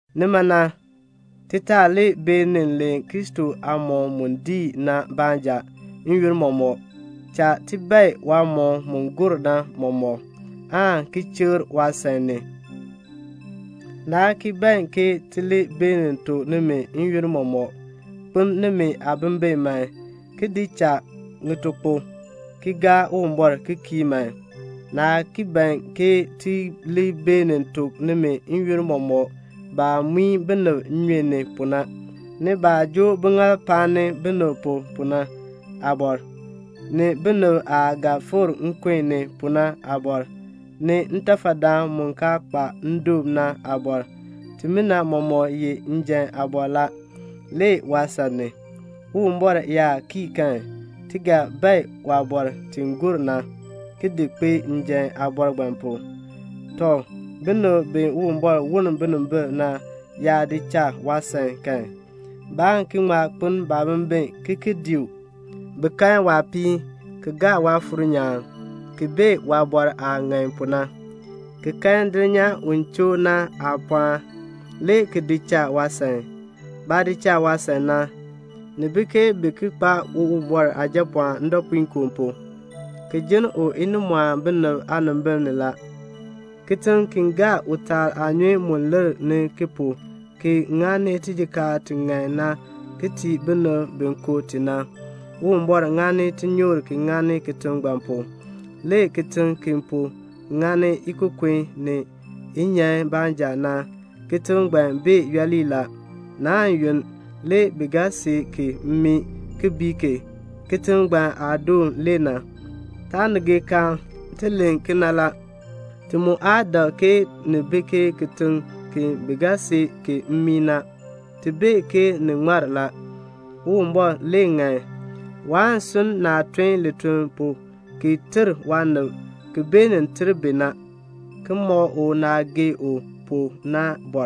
Nima na, ti taa li beenin len Kristo aamɔkm mu diin na baanja n-yoonn mɔmɔk. Cha ti bae waamɔkm mu gur na mɔmɔk, aan ki chikr waasan ni. Naa ki ban ti li beenin tuk nimi n-yoonn mɔmɔk, "Kpeln nimi aabimbin man, ki di cha ŋitukpok, ki gaa Uwumbɔr ki kii man." Naa ki ban ti li beenin tuk nimi n-yoonn mɔmɔk baah muin binib nnyun ni pu na, ni baah joo biŋaal paani binib pu na aabɔr, ni binib aah ga fikr nkun ni pu na aabɔr, ni ntafadaan mu kaa kpa ndoon na aabɔr. Timina mɔmɔk ye njan aabɔr la, le waasan ni. Uwumbɔr yaa cha kan, ti ga bae waabɔr ti gur na, ki di kpee njan aabɔr ngbaan pu. Tɔ, binib bi Uwumbɔr woln binimbil na yaa di cha waasan kan, baan ŋma ki kpeln baabimbin ki ki dii u. Bi kan waapiin, ki gaa Waafuur nyaan, ki bee waaliin aah ŋan pu na, ki kan dulnyaa u choo na aapɔɔn, le ki di cha waasan. Baah di cha waasan na, ni bi ke bi ki kpaa Uwumbɔr Aajapɔɔn ndɔpuinkoo pu, ki jinn u inimɔɔn binib aanimbil ni. Kitiŋ ki gaa utaal aanyun mu lir ki pu, ki ŋani tijikaar ti ŋan na ki tii binib bi ko ti na, Uwumbɔr ŋani tinyoor ki ŋani kitiŋ ngbaan pu. Le kitiŋ ki po ŋani ikokon ni inyan baanja na, kitiŋ ngbaan bee yooli la. Naan yunn, le bi ga see ki mmii ki bii ki. Kitiŋ ngbaan aadoon le na. Taanigeekaan, ti len kena la; ti mu aa dak ke ni bi ke kitiŋ ki bi ga see mmii na. Ti bee ke ni ŋmar la. Uwumbɔr le ŋan. Waan sunn naah tun lituln pu, ki ter waanib, ki beenin ter bi na, ki mɔk u naah gee u pu na.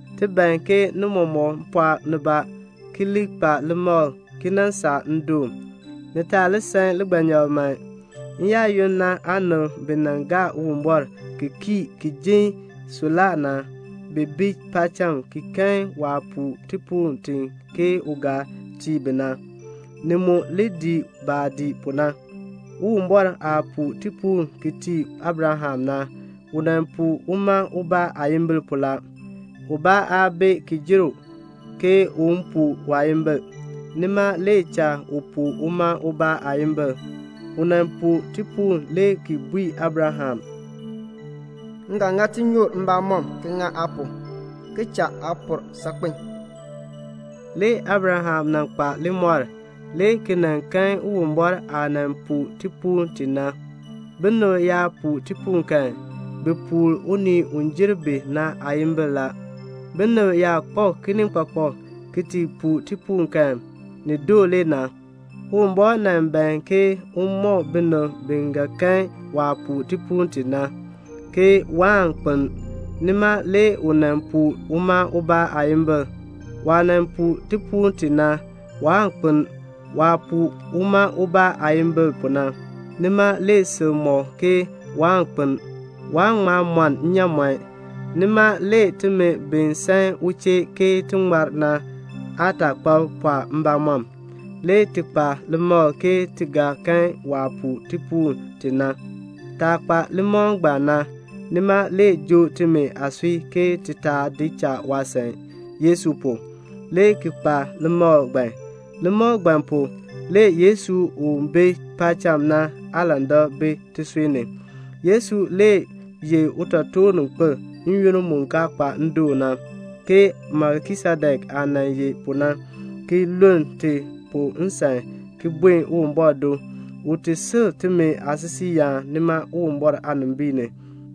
Ti ban ke ni mɔmɔk pɔɔk nibaa ki li kpa limakl ki nan saa ndoon. Ni taa li san ligbanyakl man. N-yaayoonn na aanib bi gaa Uwumbɔr ki kii ki jin suklaa na, bi bi paacham ki kan waah puu tipuul ti ke u ga tii bi na. Ni mu li dii baah dii pu na. Uwumbɔr aah puu tipuul ki tii Abraham na, u puu uma ubaa aayimbil la. Ubaa aa bi ki jer u, ke un puu waayimbil, nima le cha u puu uma ubaa aayimbil. U puu tipuul le ki bui Abraham, "M ga ŋa tinyoor mbamɔm ki ŋa aa pu, ki cha aa pɔr saakpen." Le Abraham nan kpa limɔr, le ki nan kan Uwumbɔr aah puu tipuul ti na. Binib yaa puu tipuul kan, bi puu unii u jer bi na aayimbil la. Binib yaa kpak kinikpakpak ki ti puu tipuul kan, ni doo le na. Uwumbɔr nan ban ke un mɔk binib bi ga kan waah puu tipuul ti na, ke waan kpeln. Nima le u puu uma ubaa aayimbil. Waah puu tipuul ti na, waan kpeln. Waah puu uma ubaa aayimbil na, nima le sil mɔk ke waan kpeln. Waan ŋma mɔn nnyaamɔn. Nima le timi bi san u chee ke ti ŋmar na aataakpab le pɔɔ mbamɔm, le ti kpa limakl ke ti ga kan waah puu tipuul ti na. Taah kpa limakl ngbaan na, nima le joo timi aasui ke ti taa di cha waasan. Yesu pu, le ti kpa limakl ngbaan. Limakl ngbaan pu, le Yesu u bi paacham na aalandak bi tisui ni. Yesu le ye utotoorninkpil n-yoonn mu kaa kpa ndoon na, ke Melkisedek aah nan ye pu na, ki luln ti pu nsan ki buen Uwumbɔr do, un ti si timi aasisiiyaan nima Uwumbɔr aanimbiin ni.